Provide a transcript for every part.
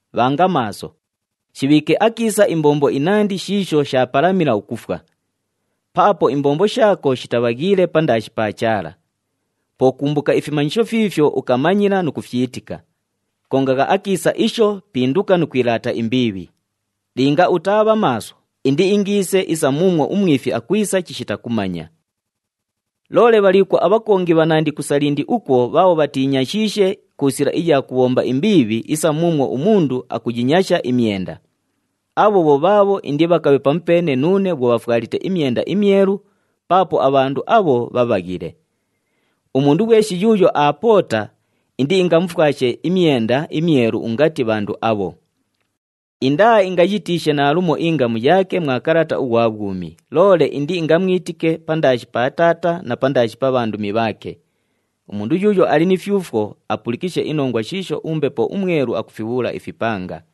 Bhanga maaso! Shibhiike akiisa imbombo inandi shiisho shaapalamila ukufwa. Paapo imbombo shaako shitabhaghiile pandaashi pa Chaala. Po kumbuka ifimanyisho fiifyo ukamanyila nu kufyitika. Kongagha akiisa isho, pinduka nu kwilaata imbiibhi. Linga utaabha maaso, indiingiise isa muumwo umwifi akwisa chishita kumanya. Loole bhaliikwo abhakongi bhanandi ku Salindi ukwo bhaabho bhatiinyashiishe ku sila iya kubhomba imbiibhi isa muumwo umundu akuyinyasha imyenda. Abho bho bhaabho indibhakabhe pamupeene nuune bhwo bhafwalite imyenda imyelu, paapo abhandu abho bhabhaghile. Umundu ghweshi yuuyo aapoota, indiingamufwashe imyenda imyelu ungati bhandu abho. Indaaingayitiishe naalumo ingamu yaake mwa kalata ughwa bhwumi, loole indiingamwitike pandaashi pa Taata na pandaashi pa bhandumi bhaake. Umundu yuuyo ali ni fyufwo, apulikishe inongwa shiisho uMbepo uMwelu akufibhuula ifipanga.”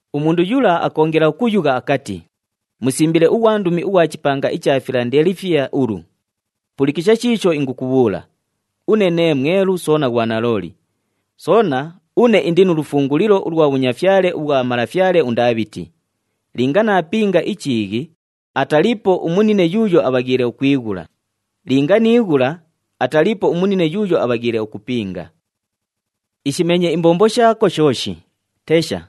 Umundu yula akoongela ukuyugha akati, “Musimbile ughwandumi ughwa chipanga icha Filandelifiya ulu: Pulikisha shiisho ingukubhuula! Une nee mwelu soona ghwa nalooli. Soona, une indi nu lufungulilo ulwa bhunyafyale ubhwa malafyale uNdaabhiti. Linga naapinga ichiighi, ataliipo umunine yuuyo abhaghiile ukwighula. Linga niighula, ataliipo umunine yuuyo abhaghiile ukupinga. Ishimeenye imbombo shaako shooshi. Tesha!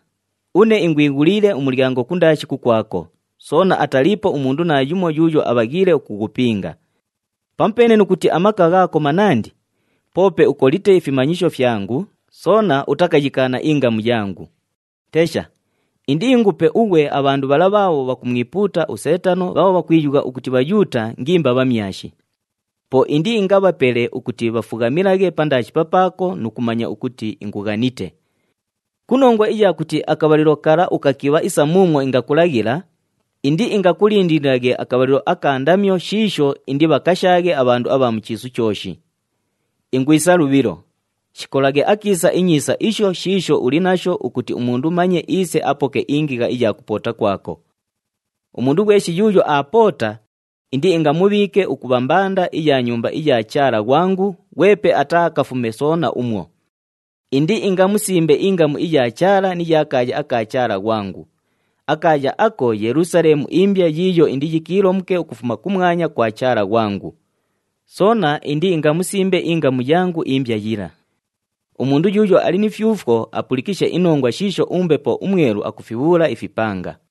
Une ingwighuliile umulyango kundaashi kukwako, soona ataliipo umundu naayumo yuuyo abhaghiile ukughupinga. Pamupeene nu kuti amaka ghaako manandi, poope ukolite ifimanyisho fyangu, soona utakayikaana ingamu yangu. Tesha! Indiingupe ughwe abhandu bhala bhaabho bhakumwipuuta uSeetano bhaabho bhakwiyugha ukuti Bhayuuta ngimba bhamyashi. Po indiingabhapele ukuti bhafughamilaghe pandaashi papaako nu kumanya ukuti ingughanite. Ku nongwa iya kuti akabhalilo kala ukakibha isa muumwo ingakulaghila, indiingakulindililaghe akabhalilo aka ndamyo shiisho indibhakashaaghe abhandu abha mu chiisu chooshi. Ingwisa lubhilo! Shikolaghe akiisa inyiisa isho shiisho uli nasho ukuti umundu manye iise apoke ingigha iya kupoota kwako. Umundu ghweshi yuuyo aapoota, indiingamubhiike ukubha mbanda iya Nyumba iya Chaala ghwangu, ghwepe ataaakafume soona umwo. Indiingamusimbe ingamu iya Chaala ni ya kaaya aka Chaala ghwangu. Akaaya ako Yelusaleemu imbya yiiyo indiyikiilomuke ukufuma kumwanya kwa Chaala ghwangu. Soona indiingamusimbe ingamu yangu imbya yila. Umundu yuuyo ali ni fyufwo, apulikishe inongwa shiisho uMbepo uMwelu akufibhuula ifipanga.”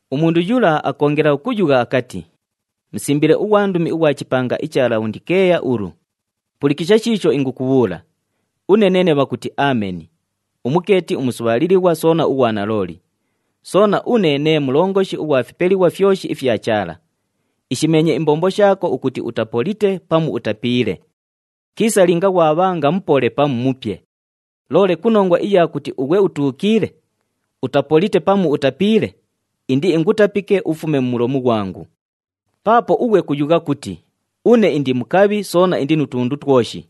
Umundu yula akoongela ukuyugha akati, “Musimbile ughwandumi ughwa chipanga icha Labhondikeeya ulu: Pulikisha shiisho ingukubhuula! Une neene bhakuti, Ameni, umukeeti umusubhaalilighwa soona ughwa nalooli. Soona, une nee Mulongoshi ughwa fipelighwa fyoshi ifya Chaala. Ishimeenye imbombo shaako ukuti utapolite pamu utapiile. Kiisa linga ghwabhanga mupole pamu mupye. Loole ku nongwa iya kuti ughwe utuukiile, utapolite pamu utapiile, indiingutapike ufume mu mulomu ghwangu. Paapo ughwe kuyugha kuti, ‘Une indi mukabhi soona indi nu tundu twoshi,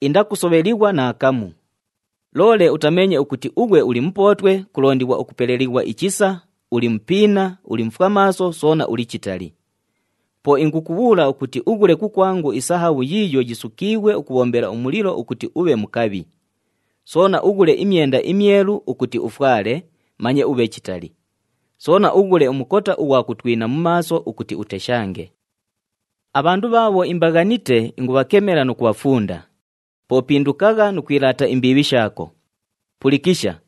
indakusobhelighwa naakamu!’ Loole utameenye ukuti ughwe uli mupootwe, kulondighwa ukupelelighwa ichisa, uli mupiina, uli mufwamaaso soona uli chitali. Po ingukubhuula ukuti ughule kukwangu isahabhu yiiyo yisukiighwe ukubhombela umulilo ukuti ubhe mukabhi. Soona ughule imyenda imyelu ukuti ufwale, manye ubhe chitali. Soona ughule umukota ughwa kutwina mu maaso ukuti uteshange. Abhandu bhaabho imbaghanite, ingubhakemela nu kubhafunda. Po pindukagha nu kwilaata imbiibhi shaako. Pulikisha!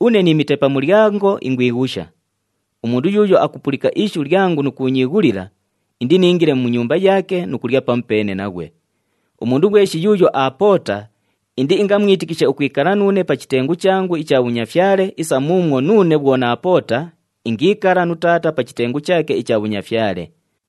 Une niimite pa mulyango ingwighusha. Umundu yuuyo akupulika ishu lyangu nu kuunyiighulila, indiniingile mu nyumba yaake nu kulya pamupeene naghwe. Umundu ghweshi yuuyo aapoota, indiingamwitikishe ukwikala nuune pa chitengu changu icha bhunyafyale, isa muumwo nuune bhwo naapoota, ingiikala nu Taata pa chitengu chaake icha bhunyafyale.